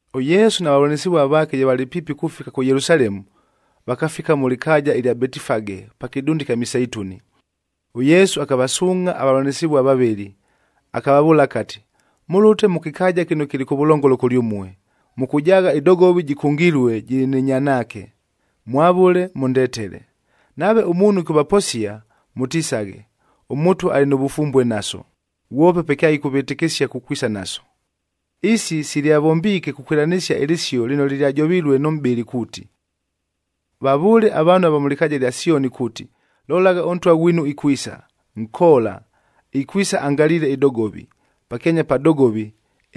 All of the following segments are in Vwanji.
ɄYesu na vavʉlanɨsɨvua vaake ye valɨ piipi kufika kʉ Yelusalemu, vakafika mʉ lɨkaaja ɨlya Betifage pa kɨdunda ɨkya Miseituni. ɄYesu akavasuungʼha avavʉlanɨsɨvua vavɨlɨ, akavavʉʉla akati, “Mʉlʉte mʉ kɨkaaja kɨno kɨlɨ kʉvʉlongolo kʉlyʉmue, mʉkʉjaagha ɨdogovi jɨkʉngilue, jɨlɨ nɨ nyanaake, mwavʉle, mʉndetele. Nave ʉmuunhu ɨkʉvaposia, mʉtisaghe, ‘ɄMʉtwa alɨ nʉ vʉfumbue naso,’ ghwope pe kyaɨkʉvɨtɨkɨsia kukwisa naso.” Isi silyavombiike kukwɨlanɨsia ɨlɨsio lɨno lɨlyajovilue nʉ mʼbɨli kuuti, “Vavʉʉle avaanhu ava mʉ lɨkaaja ɨlya Syonia kuuti, ‘Lolagha, ʉNtwa ghwinu ikwisa, nkoola, ikwisa angaliile ɨdogovi,b pakyanya pa dogovi,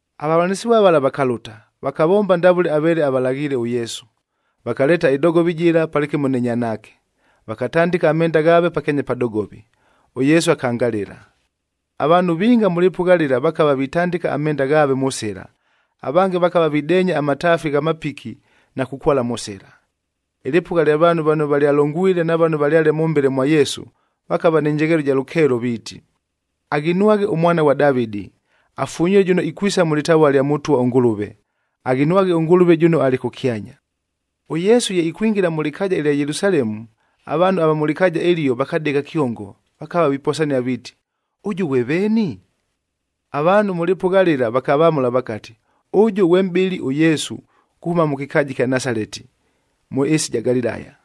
Avavʉlanɨsɨvua vala vakalʉta, vakavomba ndavʉle aveele avalaghiile ʉYesu. Vakaleeta ɨdogovi jɨla palɨkɨmo nɨ nyanaake, vakatandɨka amenda ghaave pakyanya pa dogovi, ʉYesu akangalɨla. Avaanhu vinga mʉ lɨpʉgha lɨla vakava vitandɨka amenda ghaave mʉ sɨla, avange vakava videenya amataafi gha mapiki na kukwala mʉ sɨla. Ɨlɨpʉgha lya vaanhu vano valyalongwile na vano valyale mʉmbele mwa Yesu, vakava nɨ njegheelo ɨja lʉkeelo viiti, “Aghinwaghed ʉMwana ghwa Davɨdi!e Afunyilue jʉno ikwisa mʉ lɨtavua lya Mʉtwa ʉNgʉlʉve!f Aghinwaghe ʉNgʉlʉve jʉno alɨ kʉkyanya!” ɄYesu ye ikwingila mʉ lɨkaaja ɨlya Yelusalemu, avaanhu ava mʉ lɨkaaja ɨlio vakadegha kyongo. Vakava viposia viiti, “Ʉjʉ ghwe veeni?” Avaanhu mʉ lɨpʉgha lɨla vakavamʉla vakati, “Ʉjʉ ghwe mʼbɨli ʉYesu, kuhʉma mʉ kɨkaaja ɨkya Nasaleti, mʉ ɨɨsi ɨja Galilaya.”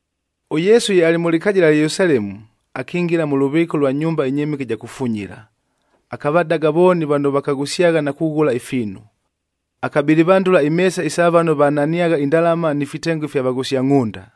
ɄYesu ye alɨ mʉ lɨkaaja ɨlya Yelusalemu, akingila mʉ lʉvɨɨka ʉlwa nyumba ɨnyɨmɨke ɨja kufunyila, akavadaga vooni vano vakaghʉsyagha na kughʉla ifiinu. Akabɨlɨvandʉla imeesa isa vano vananiagha indalama ni fitengo ifya vaghʉsia ngʼhʉnda.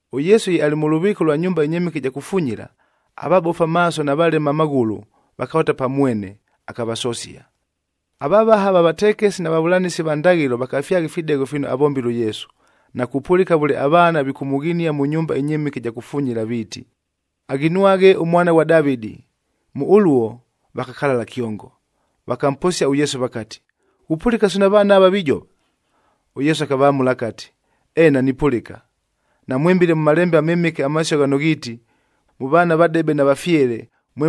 ɄYesu ye alɨ mʉ lʉvɨɨka lwa nyumba ɨnyɨmɨke ɨja kufunyila, avabofu amaaso na valema amaghʉlʉ vakalʉta pa mwene, akavasosia. Avavaha va vatekesi na vavʉlanɨsi va ndaghɨlo vakafyagha ifidegho fino avombile ʉYesu, na kupʉlɨka vʉle avaana vikʉmʉghinia mʉ nyumba ɨnyɨmɨke ɨja kufunyila viiti, “Aghinwaghe ʉMwana ghwa Davɨdi.” Mʉ ʉluo, vakakalala kyongo. Vakamposia ʉYesu vakati, “Ghupʉlɨka sino avaana ava vijova?” ɄYesu akavamʉla akati, “Eena nipʉlɨka! Namwɨmbile mʉ Malembe aMɨmɨke amasio ghano ghiiti, ‘Mʉ vaana vadebe na vafyele,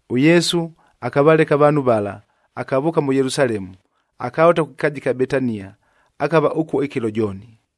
ɄYesu akavaleka avaanhu vala, akavʉʉka mʉ Yelusalemu, akalʉta kʉ kɨkaaja ɨkya Betania, akava ʉkuo ɨkɨlo jooni.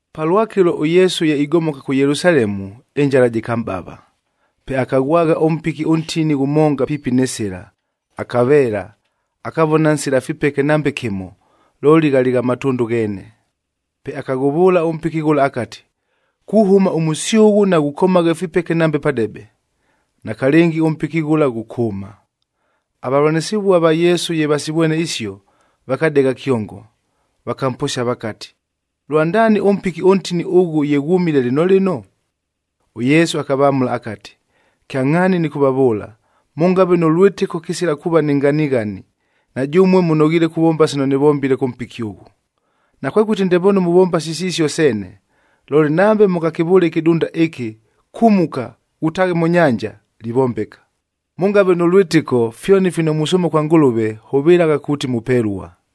Palwakɨlo ʉYesu ye igomoka kʉ Yelusalemu, ɨnjala jɨkamʼbava. Pe akaghwagha ʉmpiki ʉntini ghʉmonga piipi nɨ sɨla, akaveela, akavona nsila fipeke nambe kɨmo, looli ghalɨ gha matʉndʉ gheene. Pe akaghʉvʉʉla ʉmpiki ghʉla akati, “Kuhʉma ʉmʉsyʉghʉ naghukomagha ifipeke nambe padebe!” Nakalɨngi, ʉmpiki ghʉla ghʉkʉʉma. Avavʉlanɨsɨvua va Yesu ye vasivwene isio, vakadegha kyongo, vakamposia vakati, “Lwandaani ʉmpiki ʉntini ʉghʉ ye ghwʉmile lɨno lɨno?” ɄYesu akavamʉla akati, “Kyangʼhaani nɨkʉvavʉʉla, mʉngave nʉ lwɨtɨko, kɨsila kuuva ni nganighani, na jʉmue mʉnoghiile kuvomba sino nɨvombile kʉ mpiki ʉghʉ. Nakwekʉti ndepoonu muvomba sisisio seene, looli nambe mʉngakɨvʉʉle ɨkɨdunda ɨkɨ, ‘Kumuka, ghutaaghe mʉ nyanja,’ livombeka! Mʉngave nʉ lwɨtɨko, fyoni fino musʉʉma kwa Ngʉlʉve, hʉvɨlagha kuuti mupelua.”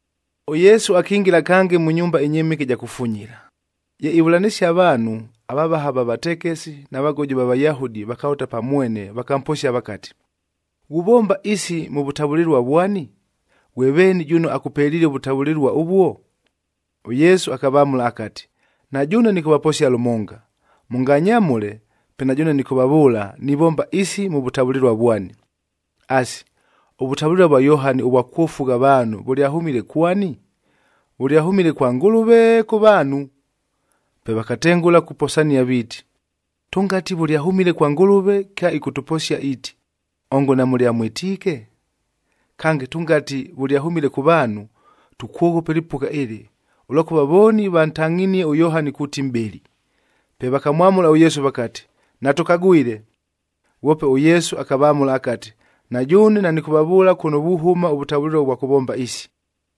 ɄYesu akingila kange mʉ nyumba ɨnyɨmɨke ɨja kufunyila. Ye ivʉlanɨsia avaanhu, avavaha va vatekesi, na vagojo va Vayahudi vakalʉta pa mwene vakamposia vakati, “Ghuvomba isi mʉ vʉtavʉlɨlua vwani? Ghwe veeni jʉno akʉpeliile ʉvʉtavʉlɨlua ʉvuo?” ɄYesu akavamʉla akati, “Na jʉʉne nɨkʉvaposia lʉmonga, mʉnganyamʉle, pe na jʉʉne nɨkʉvavʉʉla, nivomba isi mʉ vʉtavʉlɨlua vwani. Asi, ʉvʉtavʉlɨlua vwa Yohani ʉvwa kwofugha avaanhu vʉlyahʉmile kwani? Vʉlyahʉmile kwa Ngʉlʉve, kʉ vaanhu?” Pe vakatengʉla kuposania viiti, “Tʉngati vʉlyahʉmile kwa Ngʉlʉve, kyaɨkʉtʉposia iiti, ‘Ongo namʉlyamwɨtiike?’ Kange, tʉngati vʉlyahʉmile kʉ vaanhu, tukwoghopa ɨlɨpʉgha ɨlɨ, ʉlwakʉva vooni vantangʼhinie ʉYohani kuuti mʼbɨli.” Pe vakamwamʉla ʉYesu vakati, “Natʉkagwile.” Ghwope ʉYesu akavamʉla akati, “Na jʉʉne nanɨkʉvavʉʉla kʉno vuhʉma ʉvʉtavʉlɨlua ʉvwa kʉvomba isi.”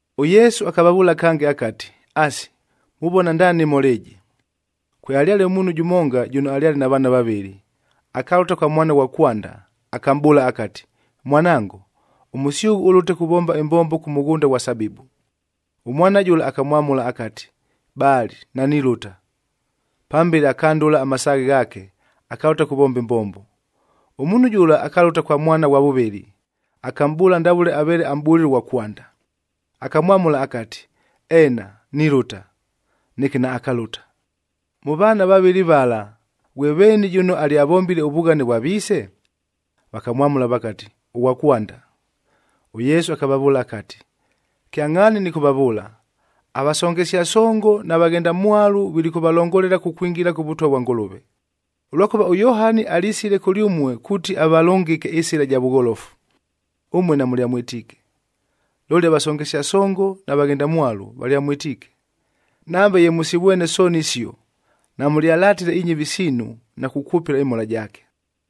ɄYesu akavavʉʉla kange akati, “Asi, muvona ndaani ɨmhola ɨjɨ? Kwealyale ʉmuunhu jʉmonga jʉno alyale na vaana vavɨlɨ. Akalʉta kwa mwana ghwa kwanda, akamʼbʉʉla akati, ‘Mwanango, ʉmʉsyʉghʉ ʉlʉte kuvomba ɨmbombo kʉ mʉghʉnda ghwa sabibu.’ Ʉmwana jʉla akamwamʉla akati, ‘Baali, nanilʉta!’ Pambele akandʉla amasaaghe ghaake, akalʉta kuvomba ɨmbombo. Ʉmuunhu jʉla akalʉta kwa mwana ʉghwa vʉvɨlɨ, akamʼbʉʉla ndavʉle aveele amʼbʉlile ʉghwa kwanda. Akamwamʉla akati, ‘Eena, nilʉta!’ Neke naakalʉta. Mʉ vaana vavɨlɨ vala, ghwe veeni jʉno alyavombile ʉvughane vwa viise?” Vakamwamʉla vakati, “Ʉghwa kwanda.” ɄYesu akavavʉʉla akati, “Kyangʼhaani nɨkʉvavʉʉla, avasongesia songo na vaghendamwalu vilikʉvalongolela kukwingila kʉ Vʉtwa vwa Ngʉlʉve. Ʉlwakʉva ʉYohani alisile kʉlyʉmue kuuti avalʉngɨke ɨsɨla ɨja vʉgholofu, ʉmue namʉlyamwɨtiike. Looli avasongesia songo na vaghendamwalu, valyamwɨtiike. Nambe ye mʉsivwene sooni isio, namʉlyalatile inyɨvi siinu na kukwʉpɨla ɨmhola jaake.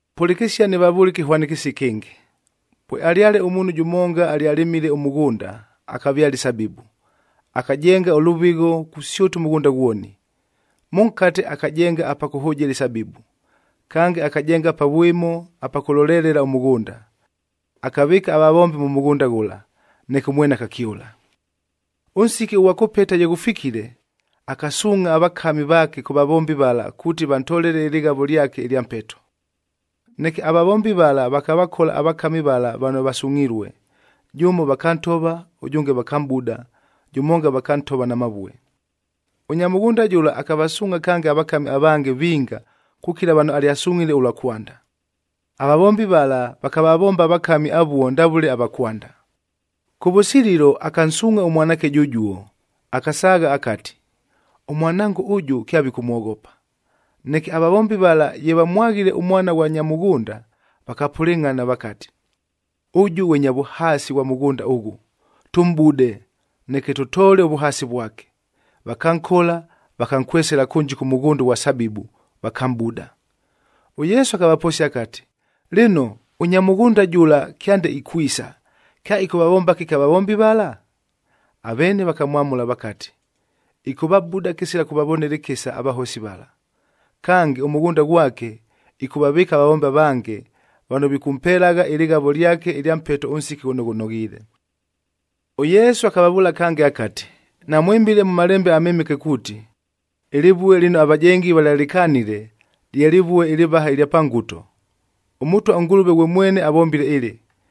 “Pʉlɨkɨsia nɨvavʉʉle ɨkɨhwanɨkɨsio ɨkɨngɨ. Pwealyale ʉmuunhu jʉmonga alyalɨmile ʉmʉghʉnda, akavyala isabibu. Akajenga ʉlʉvɨgho kusyʉta ʉmʉghʉnda ghwoni. Mʉnkate akajenga apa kʉhʉjɨla isabibu. Kange, akajenga pa vwɨmo apa kʉlolelelela ʉmʉghʉnda. Akavɨɨka avavombi mʉ mʉghʉnda ghʉla, neke ʉmwene akakyʉla. “Ʉnsiki ʉghwa kʉpeta ye ghʉfikile, akasuungʼha avakami vaake kʉ vavombi vala kuuti vantolele ɨlɨghavo lyake ɨlya mpeto. Neke avavombi vala vakavakola avakami vala vano vasungʼhilue, jʉmo vakantova, ʉjʉnge vakamʼbuda, jʉmonga vakantova na mavue. Ʉnya mʉghʉnda jʉla akavasuungʼha kange avakami avange vinga kukila vano alyavasungʼhile ʉlwa kwanda. Avavombi vala vakavavomba avakami avuo ndavʉle ava kwanda. Kʉvʉsililo akansuungʼha ʉmwanaake jʉjuo, akasaagha akati, ‘Ʉmwanango ʉjʉ, kyavikʉmwoghopa.’ Neke avavombi vala ye vamwaghile ʉmwana ghwa nya mʉghʉnda, vakapʉlɨngʼhana vakati, ‘Ʉjʉ ghwe nya vʉhaasi ghwa mʉghʉnda ʉghʉ, tʉmʼbude, neke tʉtoole ʉvʉhaasi vwake.’ Vakankola, vakankwesela kʉnji kʉ mʉghʉnda ʉghwa sabibu, vakamʼbuda.” ɄYesu akavaposia akati, “Lɨno, ʉnya mʉghʉnda jʉla kyande ikwisa, kyaɨkʉvavomba kɨki avavombi vala?” Aveene vakamwamʉla vakati, “Ɨkʉvabuda kɨsila kʉvavonela ɨkɨsa avahosi vala! Kange, ʉmʉghʉnda ghwake ɨkʉvavɨɨka avavombi avange vano vikʉmpelagha ɨlɨghavo lyake ɨlya mpeto ʉnsiki ghʉno ghʉnoghiile.” ɄYesu akavavʉʉla kange akati, “Namwɨmbile mʉ Malembe aMɨmɨke kuuti, ‘Ɨlɨvue lɨno avajengi valyalɨkanile, lye lɨvue ɨlɨvaha ɨlya pa nguto.j ɄMʉtwa ʉNgʉlʉve ghwe mwene avombile ɨlɨ,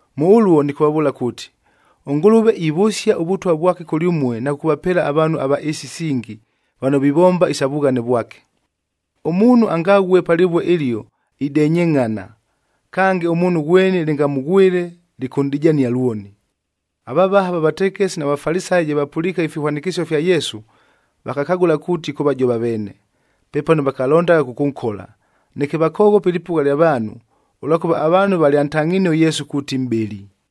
“Mʉ ʉluo, nɨkʉvavʉʉla kuuti, ʉNgʉlʉve ivʉsia ʉVʉtwa vwake kʉlyʉmue na kʉkʉvapeela avaanhu va ɨɨsi isingi vano vivomba isa vughane vwake. Ʉmuunhu angaghue pa lɨvue ɨlio, idenyengʼhana. Kange, ʉmuunhu ghweni lɨngamʉghwɨle, lɨkʉnʼdijania lwoni.” Avavaha va vatekesi na Vafalisayi ye vapʉliike ifihwanɨkɨsio fya Yesu, vakakagʉla kuuti ɨkʉvajova aveene. Pepano vakalondagha kʉkʉnkola, neke vakoghopa ɨlɨpʉgha lya vaanhu, ʉlwakʉva avaanhu valyantangʼhinie ʉYesu kuuti mʼbɨli.